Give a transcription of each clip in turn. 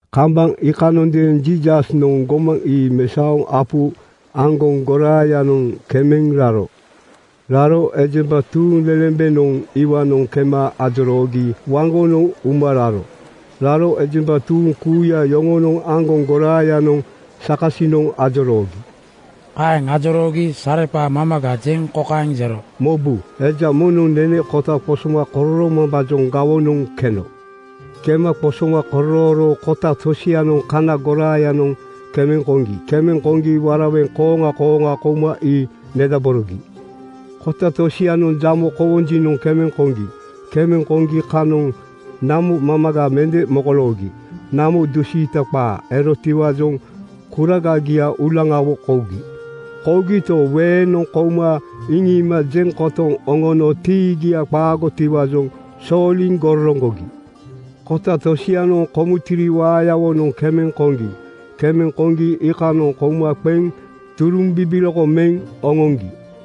Kambaŋ iikanondeeŋ Jiisasnoŋ gomaŋ ii mesaoŋ apu aŋgoŋ goraayanoŋ kemeŋ raro. Raro ejemba tuuŋlelembenoŋ iwaanoŋ kema ajoroogi waŋgonoŋ uma raro. Raro ejemba tuuŋ kuuya yoŋonoŋ aŋgoŋ goraayanoŋ sakasinoŋ ajoroogi. Kaeŋ ajoroogi sareqaa mamaga jeŋ kokaeŋ jero, “Mobu! Eja moŋnoŋ nene kota qosoma kororoomambaajoŋ gawonoŋ keno. Kema qosoma kororooro kota tosianoŋ kana goraayanoŋ kemeŋ koŋgi. Kemeŋ koŋgi (waraweŋ) kooŋa kooŋa kouma ii nedaborogi. “Kota tosianoŋ jamo kowonjinoŋ kemeŋ koŋgi. Kemeŋ koma kanoŋ namo mamaga mende mokoloogi. Namo dusiita qaa erotiwaajoŋ kuragagia uulaŋawo kougi. Kougito, weeŋnoŋ kouma iŋiima jeŋ kotoŋ oŋono tiigia qaagotiwaajoŋ sooliŋ gororoŋgogi. “Kota tosianoŋ kumuntiri waayawonoŋ kemeŋ koŋgi. Kemeŋ koŋgi iikanoŋ kouma qeŋ turuŋ bibiloko meŋ oŋoŋgi.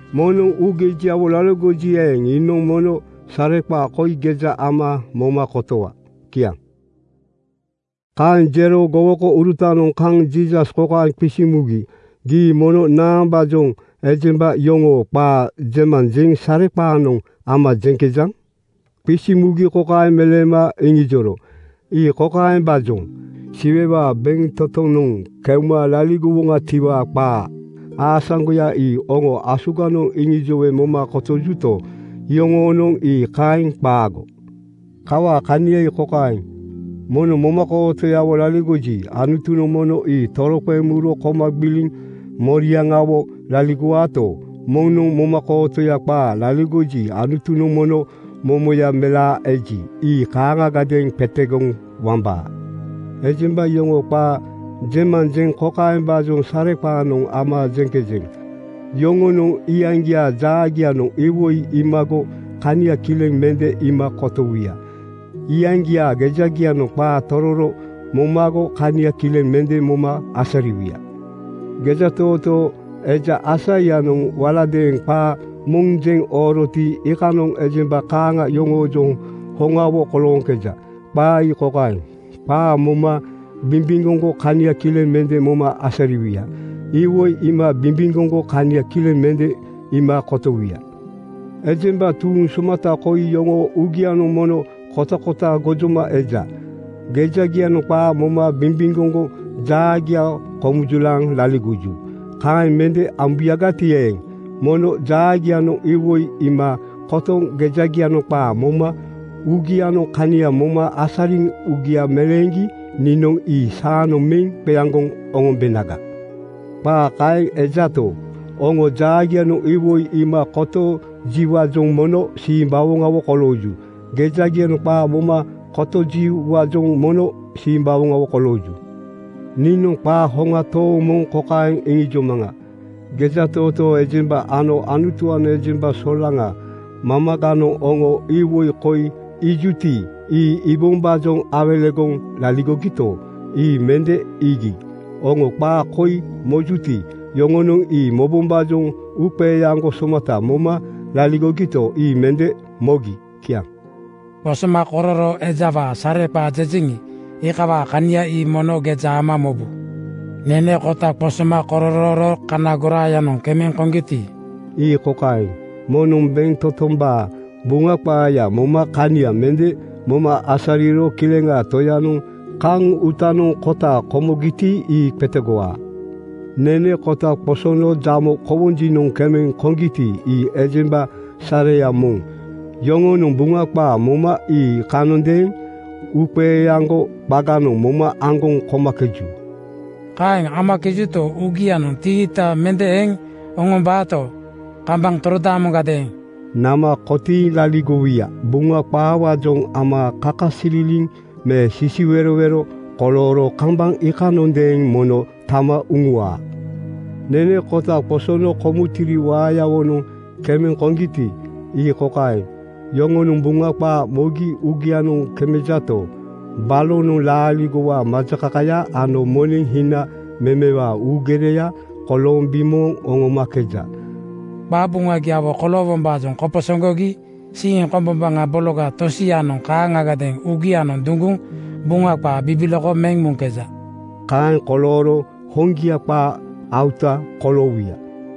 Moŋnoŋ uugejiawo laligoji eeŋ, iinoŋ mono sareqaa koi geja ama moma kotowa.” Kiaŋ. Kaeŋ jero gowokourutanoŋ kaŋ Jiisas kokaeŋ qisiŋ mugi, “Gii mono naambaajoŋ ejemba yoŋoo qaa jemanjeŋ sareqaanoŋ ama jeŋkejaŋ?” Qisiŋ mugi kokaeŋ meleema iŋijoro, “Ii kokaembaajoŋ: Siwewaa bentotonoŋ keuma laligowoŋatiwaa qaa aasaŋgoya ii oŋo asuganoŋ iŋijowe moma kotojuto, iyoŋoonoŋ ii kaeŋ qaago. “Kawaa kania ii kokaeŋ: Moŋnoŋ momakootoyawo laligoji, Anutunoŋ mono ii toroqeŋ muro koma gbiliŋ moriaŋawo laligowaato, moŋnoŋ momakootoya qaa laligoji, Anutunoŋ mono momoya melaa eji, ii kaaŋagadeeŋ qetegoŋ wambaa. “Ejemba yoŋoo qaa jemanjeŋ kokaembaajoŋ sareqaanoŋ ama jeŋkejeŋ: Yoŋonoŋ iyaŋgiaa jaagianoŋ iwoi iimago kania kileŋ mende iima kotowuya. Iyaŋgiaa gejagianoŋ qaa tororo momago kania kileŋ mende moma asariwuya. Gejatootoo eja Aisaianoŋ waladeeŋ qaa moŋ jeŋ ooroti, iikanoŋ ejemba kaaŋa yoŋoojoŋ hoŋawo kolooŋkeja. Qaa ii kokaeŋ, ‘Qaa moma bimbimgoŋgo kania kileŋ mende moma asariwuya. Iwoi iima bimbimgoŋgo kania kileŋ mende iima kotowuya. Ejemba tuuŋ somata koi yoŋoo uugianoŋ mono kotakota gojoma eja. Gejagianoŋ qaa moma bimbimgoŋgo jaagia komujulaaŋ laligoju. Kaeŋ mende ambuyagati eeŋ, mono jaagianoŋ iwoi iima kotoŋ gejagianoŋ qaa moma uugianoŋ kania moma asariŋ uugia meleeŋgi niinoŋ ii saanoŋ meŋ qeaŋgoŋ oŋombenaga.’ “Qaa kaeŋ ejato, oŋoo jaagianoŋ iwoi iima kotojiwaajoŋ mono simbawoŋawo kolooju. Gejagianoŋ qaa moma kotojiwaajoŋ mono simbawoŋawo kolooju. Niinoŋ qaa hoŋa tooŋ moŋ kokaeŋ iŋijomaŋa: Gejatootoo ejemba ano Anutuwaanoŋ ejemba solaŋa mamaganoŋ oŋo iwoi koi iijuti, ii iibombaajoŋ awelegoŋ laligogito, ii mende iigi. Oŋo qaa koi mojuti, yoŋonoŋ ii mobombaajoŋ uuqeeaŋgo somata moma laligogito, ii mende mogi. Kiaŋ. “Qosomakororoo ejawaa sareqaa jejeŋi, iikawaa kania ii mono geja ama mobu. Nene kota qosoma kororooro kana goraayanoŋ kemeŋ konoti, ii kokaeŋ: Moŋnoŋ bentotombaa Buŋa qaaya moma kania mende moma asariro Kileŋaa Toyanoŋ kaŋ uutanoŋ kota komogiti, ii qetegowaa. Nene kota qosono jamo kowonjinoŋ kemeŋ konoti, ii ejemba sareya moŋ. Yoŋonoŋ Buŋa qaa moma ii iikanondeeŋ uuqeeaŋgo qaganoŋ moma aŋgoŋ komakeju. “Kaeŋ amakejuto, uugianoŋ tiita mende eŋ oŋombaato, kambaŋ torodaamoŋgadeeŋ nama kotiiŋ laligowuya. Buŋa qaawaajoŋ ama kakasililiŋ me sisiwerowero kolooro kambaŋ iikanondeeŋ mono tama uŋuwaa. Nene kota qosono kumuntiri waayawonoŋ kemeŋ koŋgiti, ii kokaeŋ: Yoŋonoŋ Buŋa qaa mogi uugianoŋ kemejato, balonoŋ laaligowaa majakakaya ano moneŋ hina memewaa uugereya kolooŋ bimooŋ oŋomakeja. Qabuŋagiawo koloowombaajoŋ koposoŋgogi siiŋ kombombaŋa bologa tosianoŋ kaaŋagadeeŋ uugianoŋ duŋguŋ Buŋa qaa bibiloko meŋ muŋkeja. Kaeŋ kolooro hoŋgia qaa auta (gipeya) koloowuya.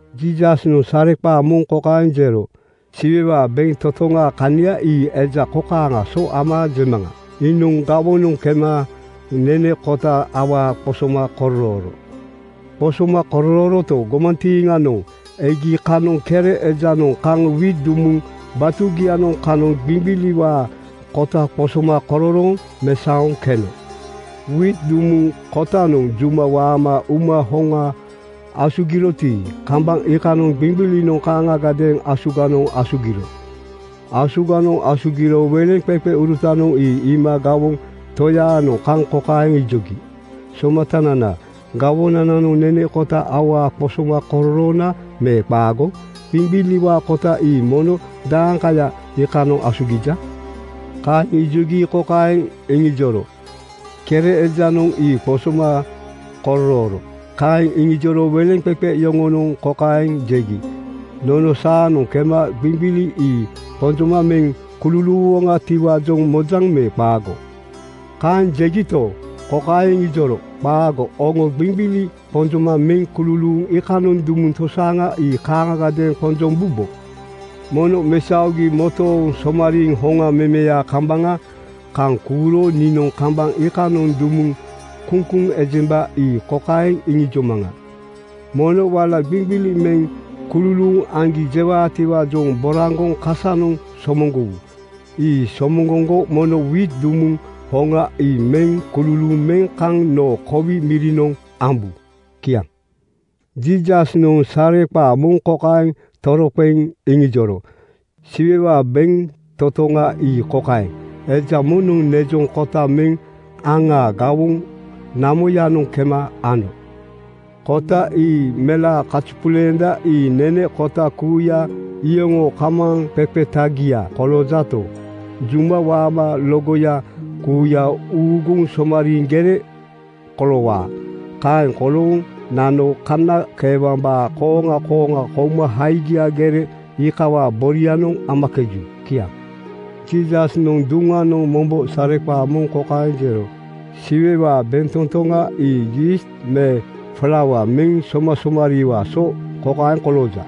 Jiisasnoŋ sareqaa moŋ kokaeŋ jero, “Siwewaa bentotoŋaa kania ii eja kokaaŋaa so ama jemaŋa. Iinoŋ gawoŋanoŋ kema nene kota awaa qosoma kororooro. Qosoma kororooroto, gomantiiŋanoŋ egi kanoŋ kere ejanoŋ kaŋ wiit dumuŋ batugianoŋ kanoŋ qiŋqiliwaa kota qosoma kororooŋ mesaoŋ keno. Wiit dumuŋ kotanoŋ juma waama uma hoŋa asugiroti, kambaŋ iikanoŋ qiŋqilinoŋ kaaŋagadeeŋ asuganoŋ asugiro. “Asuganoŋ asugiro weleŋqeqeurutanoŋ ii iima gawoŋ toyaanoŋ kaŋ kokaeŋ ijogi, ‘Somatanana, gawoŋganoŋ nene kota awaa qosoma kororoona me qaago? Qiŋqiliwaa kota ii mono daaŋkaya iikanoŋ asugija?’ “Kaeŋ ijogi kokaeŋ iŋijoro, ‘Kere ejanoŋ ii qosoma kororooro.’ Kaeŋ iŋijoro weleŋqeqe yoŋonoŋ kokaeŋ jegi, ‘Nono saanoŋ kema qiŋqili ii qonjoma meŋ kululuuwoŋatiwaajoŋ mojaŋ me qaago?’ Kaeŋ jegito, kokaeŋ iŋijoro, ‘Qaago! Oŋo qiŋqili qonjoma meŋ kululuuŋ iikanoŋ dumuŋ tosaaŋa ii kaaŋagadeeŋ qonjombubo. “Mono mesaogi motooŋ somariiŋ hoŋa memeyaa kambaŋa kaŋ kuuro niinoŋ kambaŋ iikanoŋ dumuŋ kuŋkuŋ ejemba ii kokaeŋ iŋijomaŋa: Mono wala qiŋqili meŋ kululuuŋ aŋgi jewaatiwaajoŋ boraŋgoŋ kasanoŋ somoŋgowu. Ii somoŋgoŋgo mono wiit dumuŋ hoŋa ii meŋ kululuuŋ meŋ kaŋ noo kowi mirinoŋ ambu.” ’ Kiaŋ. Jiisasnoŋ sareqaa moŋ kokaeŋ toroqeŋ iŋijoro, “Siwewaa bentotoŋa ii kokaeŋ: Eja moŋnoŋ nejoŋ kota meŋ aŋaa gawoŋ namoyanoŋ kema ano. Kota ii melaa kazupuleenda. Ii nene kota kuuya iyoŋoo kamaaŋqeqetagia koloojato, juma waama logoya kuuya uŋuuguŋ somariiŋ gere koloowaa. Kaeŋ kolooŋ nano kanakeewambaa kooŋa kooŋa kouma haigia gere iikawaa borianoŋ amakeju.” Kiaŋ. Jiisasnoŋ duŋanoŋ mombo sareqaa moŋ kokaeŋ jero: “Siwewaa bentotoŋa ii yiist me flaua meŋ somasomariiwaa so kokaeŋ kolooja: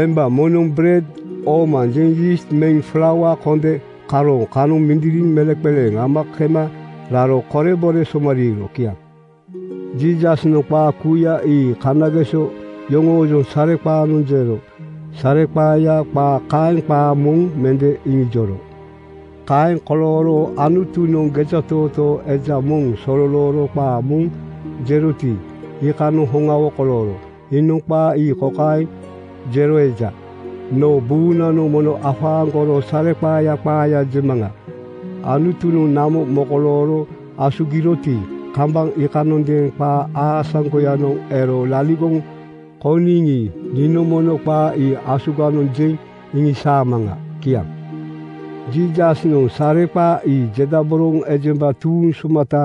Emba moŋnoŋ bered oomanjeŋ yiist meŋ flaua konde karooŋ kanoŋ mindiriŋ meleŋqeleeŋ ama kema raro korebore somariiro.” Kiaŋ. Jiisasnoŋ qaa kuuya ii kanageso yoŋoojoŋ sareqaanoŋ jero. Sareqaaya qaa kaeŋ qaa moŋ mende iŋijoro. Kaeŋ kolooro Anutunoŋ gejatootoo eja moŋ sololooro qaa moŋ jeroti, iikanoŋ hoŋawo kolooro. Iinoŋ qaa ii kokaeŋ jero eja, “Noo buunanoŋ mono afaaŋgoro sareqaaya qaaya jemaŋa. Anutunoŋ namo mokolooro asugiroti, kambaŋ iikanondeeŋ qaa aasaŋgoyanoŋ ero laligoŋ kouniŋi, niinoŋ mono qaa ii asuganoŋ jeŋ iŋisaamaŋa.” Kiaŋ. Jiisasnoŋ sareqaa ii jedaboroŋ ejemba tuuŋ somata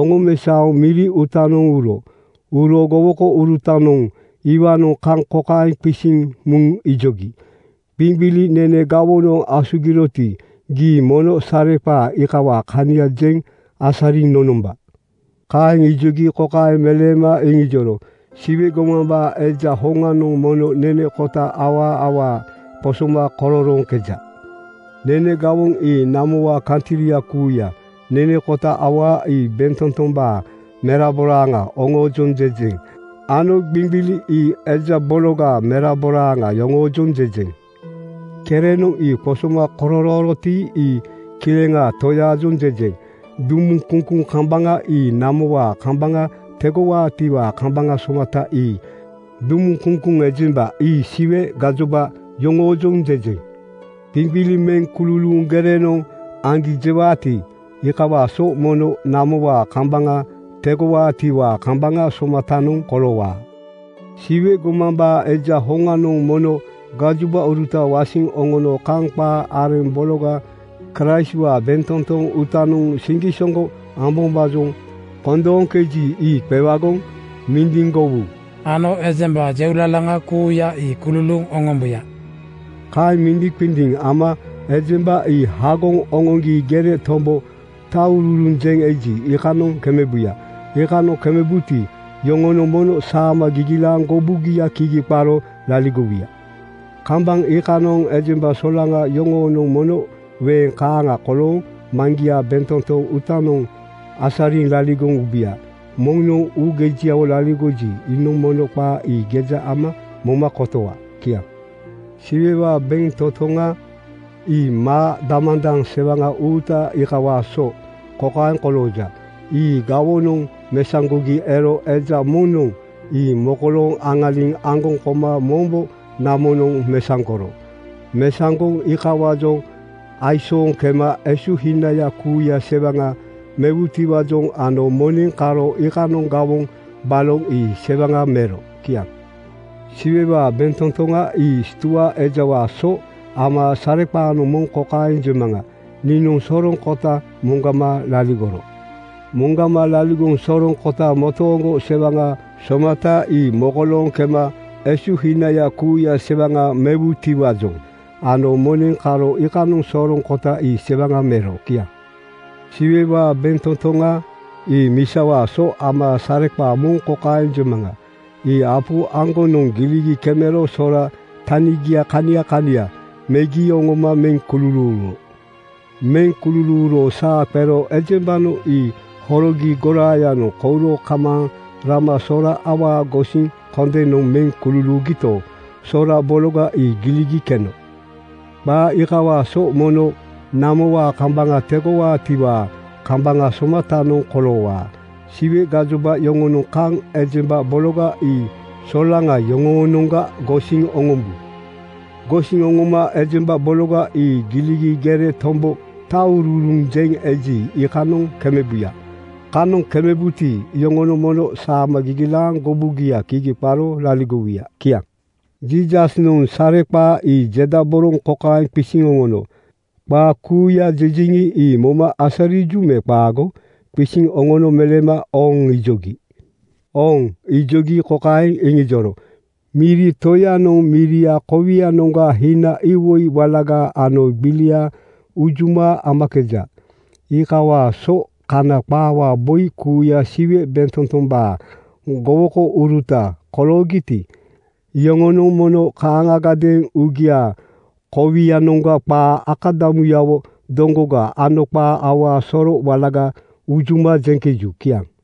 oŋomesaoŋ miri uutanoŋ uro. Uro gowokourutanoŋ iwaanoŋ kaŋ kokaeŋ qisiŋ muŋ ijogi, “Qiŋqili nene gawonoŋ asugiroti, gii mono sareqaa iikawaa kania jeŋ asariŋ nonomba.” Kaeŋ ijogi kokaeŋ meleema iŋijoro, “Siwe gomambaa Eja hoŋanoŋ mono nene kota awaa awaa qosoma kororooŋkeja. Nene gawoŋ ii namowaa kantri kuuya. Nene kota awaa ii bentotombaa meraboraaŋa oŋoojoŋ jejeŋ ano qiŋqili ii eja bologaa meraboraaŋa yoŋoojoŋ jejeŋ. Kerenoŋ ii qosoma kororooroti, ii Kileŋaa Toyaajoŋ jejeŋ. Dumuŋ kuŋkuŋ kambaŋa ii namowaa kambaŋa tegowaatiwaa kambaŋa somata ii. Dumuŋ kuŋkuŋ ejemba ii Siwe gajoba yoŋoojoŋ jejeŋ. “Qiŋqili meŋ kululuuŋ gerenoŋ aŋgi jewaati, iikawaa so mono namowaa kambaŋa tegowaatiwaa kambaŋa somatanoŋ koloowaa. Siwe gomambaa Eja hoŋanoŋ mono gajobauruta wasiŋ oŋono kaŋ qaa areŋ bologa Kraistwaa bentotoŋ uutanoŋ siŋgisoŋgo ambombaajoŋ kondooŋkeji, ii qewagoŋ mindiŋgowu ano ejemba jeulalaŋa kuuya ii kululuuŋ oŋombuya. “Kaeŋ mindiŋqindiŋ ama ejemba ii hagoŋ oŋoŋgi gere tombo taŋururuŋ jeŋ eji, iikanoŋ kemebuya. Iikanoŋ kemebuti, iyoŋonoŋ mono saama gigilaaŋ gobugia kigi qaro laligowuya. Kambaŋ iikanoŋ ejemba solaŋa yoŋonoŋ mono weeŋ kaaŋa kolooŋ Maŋgiaa bentotoŋ uutanoŋ asariŋ laligoŋ ubuya. Moŋnoŋ uugejiawo laligoji, iinoŋ mono qaa ii geja ama moma kotowa. Kiaŋ. “Siwewaa bentotoŋa ii maa damandaŋ sewaŋa uuta iikawaa so kokaeŋ kolooja: Ii gawonoŋ mesaŋgogi ero eja moŋnoŋ ii mokolooŋ aŋaliŋ aŋgoŋ koma mombo namonoŋ mesaŋgoro. Mesaŋgoŋ iikawaajoŋ aisooŋ kema esuhinaya kuuya sewaŋa mewutiwaajoŋ ano moneŋ karo iikanoŋ gawoŋ baloŋ ii sewaŋa mero.” Kiaŋ. “Siwewaa bentotoŋa ii stua ejawaa so ama sareqaa moŋ kokaeŋ jemaŋa: Iinoŋ soroŋ kota moŋgama laligoro. Moŋgama laligoŋ soroŋ kota motooŋgo sewaŋa somata ii mokolooŋ kema esuhinaya kuuya sewaŋa mewutiwaajoŋ ano moneŋ karo iikanoŋ soroŋ kota ii sewaŋa mero.” Kiaŋ. “Siwewaa bentotoŋa ii misawaa so ama sareqaa moŋ kokaeŋ jemaŋa: Ii apu aŋgonoŋ giligi kemero sora tanigia kania kania kemegi oŋoma meŋ kululuuro. Meŋ kululuuro saa qero ejembanoŋ ii horogi goraayanoŋ kouro kamaaŋ rama sora awaa gosiŋ kondenoŋ meŋ kululuugito, soro bologa ii giligi keno. Qaa iikawaa so mono namowaa kambaŋa tegowaatiwaa kambaŋa somatanoŋ koloowaa. Siwe gajoba yoŋonoŋ kaŋ ejemba bologa ii solaŋa yoŋoonoŋga gosiŋ oŋombu. Gosiŋ oŋoma ejemba bologa ii giligi gere tombo taŋururuŋ jeŋ eji, iikanoŋ kemebuya. Kanoŋ kemebuti, iyoŋonoŋ mono saama gigilaaŋ gobugia kigi qaro laligowuya.” Kiaŋ. Jiisasnoŋ sareqaa ii jedaboroŋ kokaeŋ qisiŋ oŋono, “Qaa kuuya jejeŋi, ii moma asariju me qaago?” Qisiŋ oŋono meleema “Ooŋ!” ijogi. “Ooŋ!” ijogi kokaeŋ iŋijoro, “Miri toyanoŋ miriaa kowianoŋga hina iwoi walaga ano gbilia unjuma amakeja. Iikawaa so Kana qaawaa boi kuuya Siwe bentotombaa gowokouruta koloogiti, iyoŋonoŋ mono kaaŋagadeeŋ uugiaa kowianoŋga qaa akadamugiawo doŋgoga ano qaa awaa soro walaga unjuma jeŋkeju.” Kiaŋ.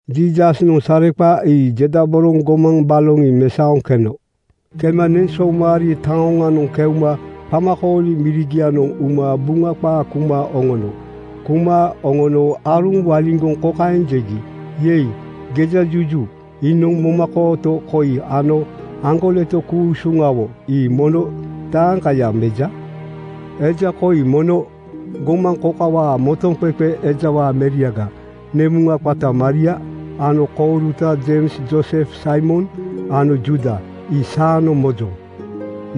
Jiisasnoŋ sareqaa ii jedaboroŋ gomaŋ baloŋ ii mesaoŋ keno. Kema neŋsoomari taoŋanoŋ keuma qamakooli mirigianoŋ uma Buŋa qaa kuma oŋono. Kuma oŋono aaruŋ waliŋgoŋ kokaeŋ jegi, “Yei, gejajuju! Iinoŋ momakooto koi ano aŋgoleto ku-usuŋawo ii mono daeŋkaya meja? Eja koi mono gomaŋ kokawaa motoŋqeqe ejawaa meriaga. Nemuŋaa qata Maria ano kouruta Jeims, Joosef, Saimon ano Juuda. Ii saanoŋ mojoŋ.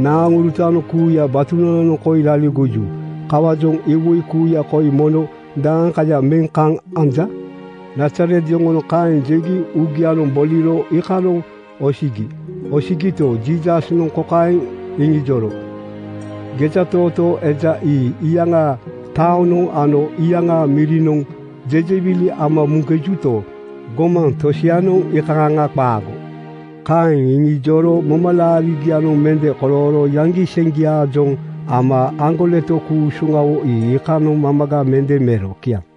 Naaŋurutanoŋ kuuya batunananoŋ koi laligoju. Kawaajoŋ iwoi kuuya koi mono daeŋkaya meŋ kaŋ anja?” Nazaret yoŋonoŋ kaeŋ jegi uugianoŋ boliro iikanoŋ osigi. Osigito, Jiisasnoŋ kokaeŋ iŋijoro, “Gejatootoo eja ii iyaŋaa taonoŋ ano iyaŋaa mirinoŋ jejewili ama muŋkejuto, gomaŋ tosianoŋ iikaaŋa qaago.” Kaeŋ iŋijoro momalaarigianoŋ mende kolooro yaŋgiseŋgiaajoŋ ama aŋgoleto ku-usuŋawo ii iikanoŋ mamaga mende mero. Kiaŋ.